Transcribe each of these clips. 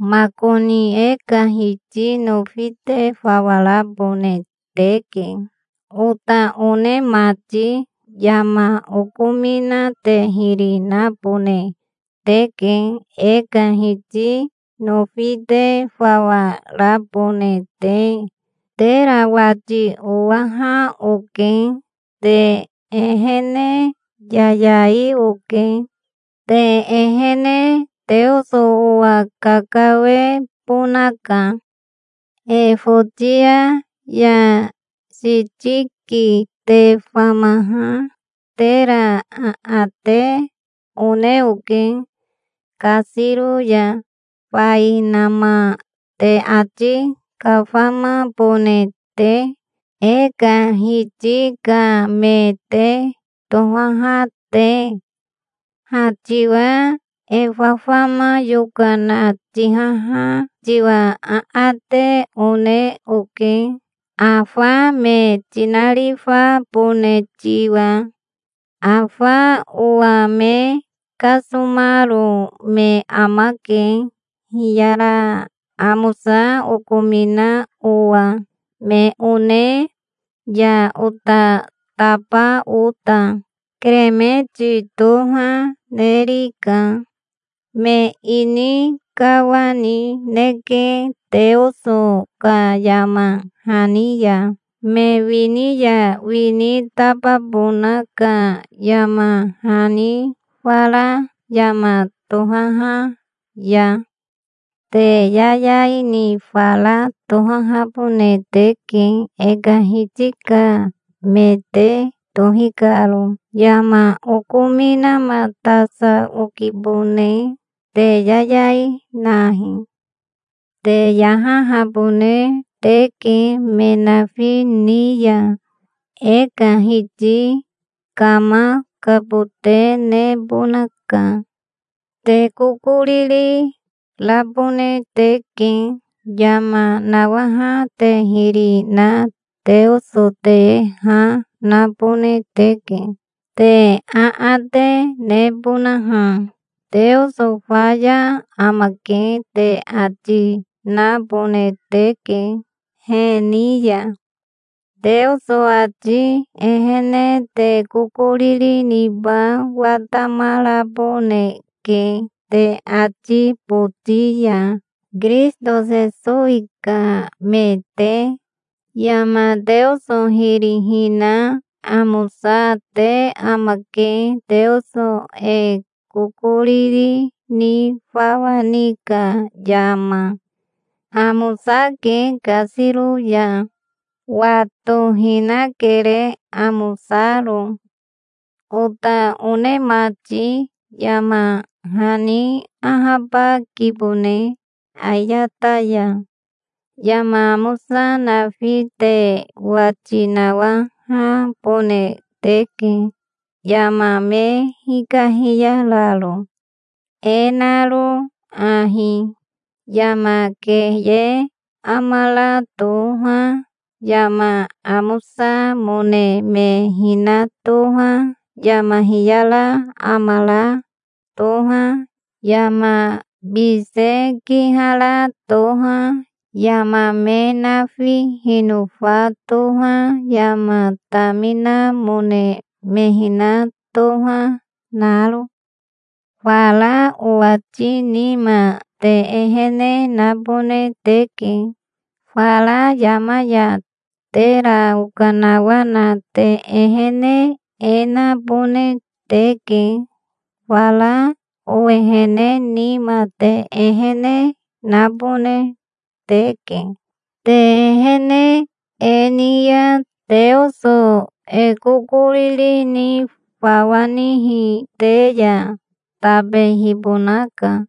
Makoni e ka Hiti nofi te fawa rabone teke, ota one mati. Yama okomina te hiri nabone teke, e ka Hiti nofi te fawa rabone te. Tera wati owaha oke. Te ehene yayai oke. Te ehene Teoso owa kakawebonaka. Efotia ya Sitiki te famaha tera aate one oke kasiro ya, fainama te ati kafamabone te, e ka Hiti ka me te tohaha te. Ha tiwa e fafama yokana tihaha tiwa aate, one oke, afa me tinarifabone tiwa. Afa owa me kasomaro me amake, hiyara amosa okomina owa, me one ya ota taba ota. Keremeti toha nerika. Me ini kawanineke Teoso ka yama hani ya, me wini ya wini tababona ka yama hani fara yama tohaha ya. Te yayai ni fara tohahabone teke, e ka Hiti ka me te tohi karo. Yama okominamatasa okibone. Te yayai nahi. Te yahahabone teke me nafi ni ya. E ka Hiti kamakabote nebonaka. Te kokoriri rabone teke. Yama nawaha te hiri na Teoso te ha nabone teke, te aate nebonaha. "Teoso faya amake", te ati, nabone teke he ni ya. Teoso ati ehene te kokoriri niba watamaraboneke te ati boti ya, Kirisito Sesowi ka me te. Yama Teoso hiri hina amosate amake, Teoso e kokoriri ni fawa ni ka yama. Amosake kasiro ya. Watohinakere, amosaro. Ota one mati, yama hani ahabakibone ayata ya. Yama amosa nafi te wati nawahabone teke, yama me hikahiyararo, e naro ahi: yama keye amara toha, yama amosamone me hina toha, yama hiyara amara toha, yama bise kihara toha, yama me nafi hinofa toha, yama taminamone me hina toha naro. Fara owati nima te ehene nabone teke. Fara yama ya tera okanawana te ehene e nabone teke. Fara owehene nima te ehene nabone teke. Te ehene e ni ya Teoso e kokoriri ni fawa nihi te ya tabehibonaka.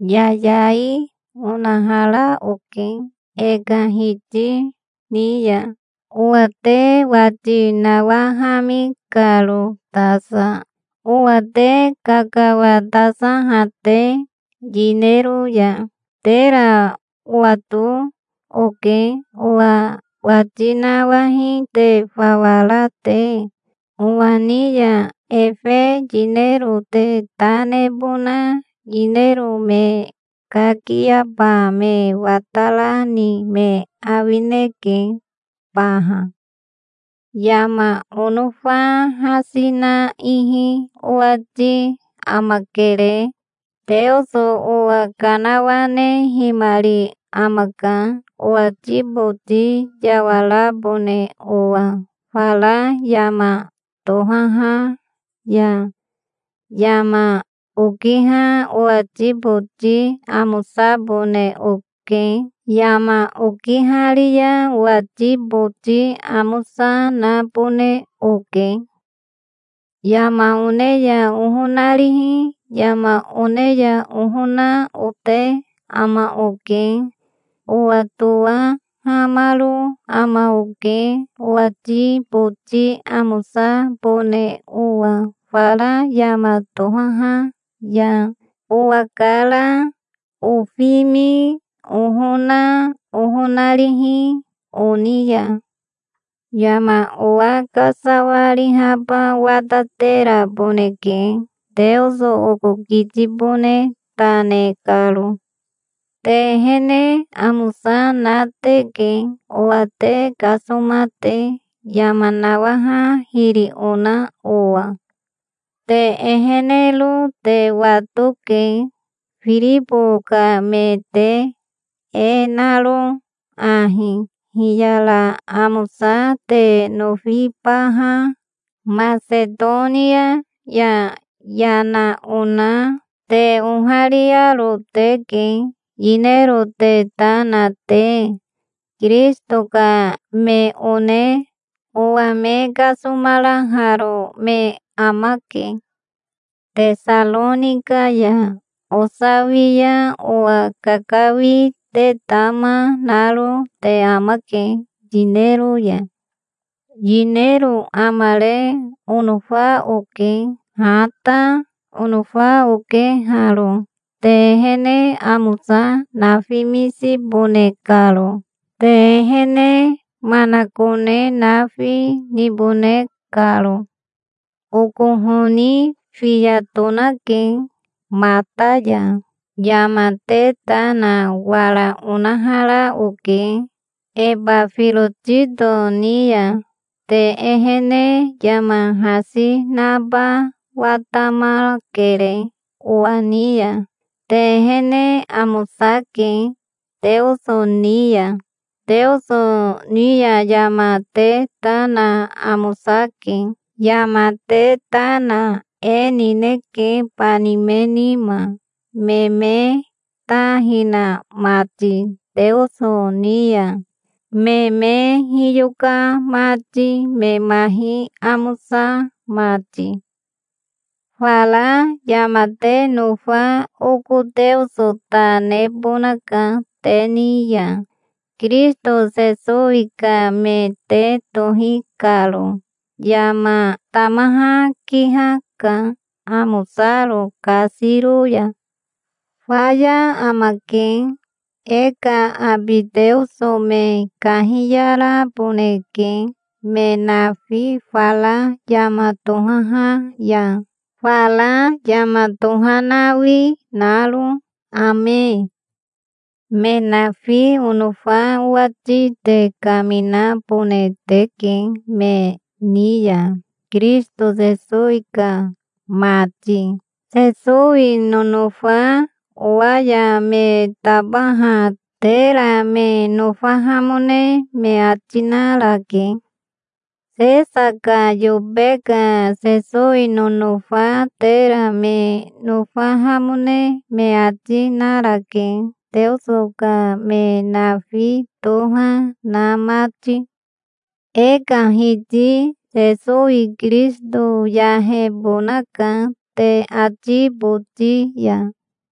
Yayai onahara oke e ka Hiti ni ya, owa te wati nawahami karo tasa, owa te kakawatasaha te yinero ya. Tera owato oke, owa wati nawahi te fawa ra te. Owa ni ya efe yinero te ta nebona yinero me kakiaba me watarani me awineke baha. Yama onofa hasi na ihi owati amakere. Teoso owa kanawanehimari amaka, owati boti yawarabone owa fara yama tohaha ya. Yama okiha owati boti amosabone oke. Yama okihari ya owati boti amosa nabone oke. Yama one ya ohonarihi, yama one ya ohona, ote ama oke. Owatowahamaro ama oke, owati boti amosabone owa fara yama tohaha ya, owakara, ofimi, ohona, ohonarihi, oni ya. Yama owa kasawarihaba watateraboneke, Teoso oko kitibone ta ne karo. Te ehene amosa na teke, owa te kasoma te, yama nawaha hiri ona owa. Te ehenero te watoke, Firibo ka me te, e naro ahi: hiyara amosa te nofibaha Masetonia ya yana ona te ohariaro teke, yinero te ta na te. Kirisito ka me one owa me kasomaraharo me amake. Tesaronika ya osawia owa kakawi te tama naro te amake yinero ya. Yinero amare onofa oke. Ha ta onofa oke haro, te ehene amosa nafimisibone karo, te ehene manakone nafi nibone karo. Oko honi fiya tonake mata ya. Yama te ta na wara onahara oke Ebafirotito ni ya. Te ehene yama hasi naba watamakere owa ni ya. Te ehene amosake Teoso ni ya. Teoso ni ya yama te ta na amosake. Yama te ta na e nineke, bani me nima, me me ta hina mati Teoso ni ya, me me hiyoka mati, me mahi amosa mati. Fara yama te nofa oko Teoso ta nebonaka te ni ya, Kirisito Sesowi ka me te tohi karo. Yama tamaha kihaka, amosaro kasiro ya. Faya amake. E ka abi Teoso me kahiyaraboneke me nafi fara yama tohaha ya, fara yama tohanawi naro. Ame. Me nafi onofa owati te kaminabone teke me ni ya, Kirisito Sesowi ka mati. Sesowi nonofa owa ya me tabaha tera me nofahamone me ati narake. Sesa ka yobe ka Sesowi nonofa tera me nofahamone me ati narake, Teoso ka me nafi toha na mati. E ka Hiti Sesowi Kirisito yahebonaka te ati boti ya.